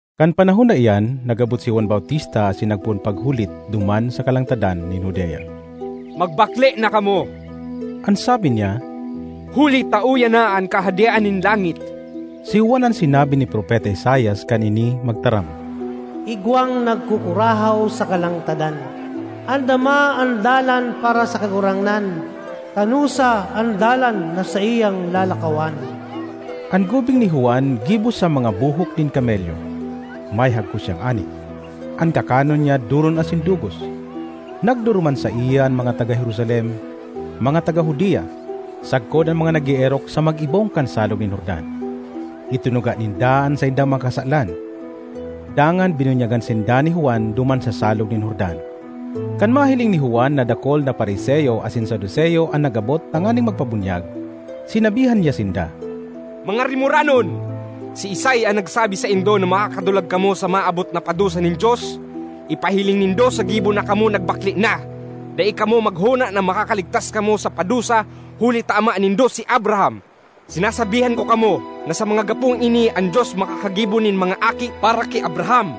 Kan panahon na iyan, nag-abot si Juan Bautista asin nagpoon paghulit duman sa kalangtadan nin Judea. ”Magbakle na kamo,” an sabi niya, “huli ta uya na an Kahadean nin langit!” Si Juan an sinabi ni Propeta Isaias kan ini magtaram, “Igwang nagkukurahaw sa kalangtadan, ‘Andama an dalan para sa Kagurangnan; tanosa an dalan na saiyang lalakawan!’” An gubing ni Juan gibo sa mga buhok nin kamelyo, may hagkos siyang anit. An kakanon niya doron asin dugos. Nagduruman saiya an mga taga Jerusalem, mga taga Judea, sagkod an mga nag-eerok sa mag-ibong kan Salog nin Jordan. Itinuga ninda an saindang mga kasalan, dangan binunyagan sinda ni Juan duman sa Salog nin Jordan. Kan mahiling ni Juan na dakul na Fariseo asin Saduceo an nag-abot tanganing magpabunyag, sinabihan niya sinda, “Mga rimoranon! Siisay an nagsabi saindo na makakadulag kamo sa maabot na padusa nin Dios? Ipahiling nindo sa gibo na kamo nagbakle na. Dai kamo maghona na makakaligtas kamo sa padusa huli ta ama nindo si Abraham. Sinasabihan ko kamo, na sa mga gapong ini an Dios makakagibo nin mga aki para ki Abraham.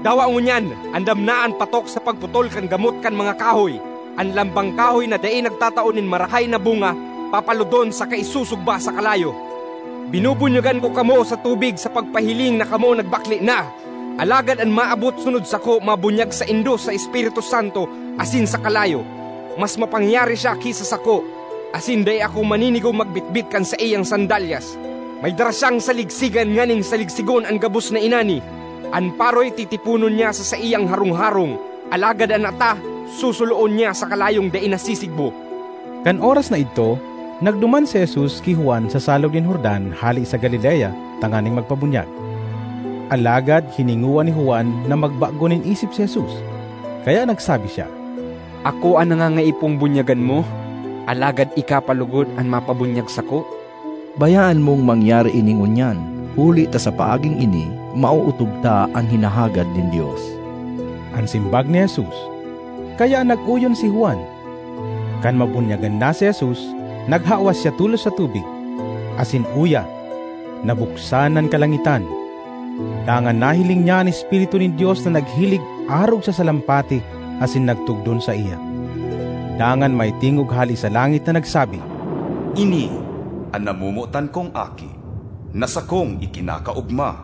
Dawa ngunyan, andam na an patok sa pagputol kan gamot kan mga kahoy; an lambang kahoy na dai nagtatao nin marahay na bunga papalodon saka isusugba sa kalayo. Binubunyagan ko kamo sa tubig sa pagpahiling na kamo nagbakle na, alagad an maabot sunod sako mabunyag saindo sa Espiritu Santo asin sa kalayo. Mas mapangyari siya ki sa sako; asin dai ako maninigong magbitbit kan saiyang sandalyas. May dara siyang saligsigan nganing saligsigon an gabos na inani. An paroy titiponon niya sa saiyang harong-harong, alagad an ata susuloon niya sa kalayong dai nasisigbo.” Kan oras na idto, nagduman si Jesus ki Juan sa Salog nin Jordan hale sa Galilea tanganing magpabunyag. Alagad hiningowa ni Juan na magbago nin isip si Jesus, kaya nagsabi siya, “Ako an nangangaipong bunyagan mo, alagad ika pa logod an mapabunyag sako?” ”Bayaan mong mangyari ini ngunyan, huli ta sa paaging ini maootob ta an hinahagad nin Dios,” an simbag ni Jesus. Kaya nag-oyon si Juan. Kan mabunyagan na si Jesus, naghawas siya tolos sa tubig, asin uya, nabuksan an kalangitan, dangan nahiling niya an Espiritu nin Dios na naghilig arog sa salampati asin nagtugdon saiya. Dangan may tingog hale sa langit na nagsabi, “Ini an namomotan kong Aki na sakong ikinakaogma.”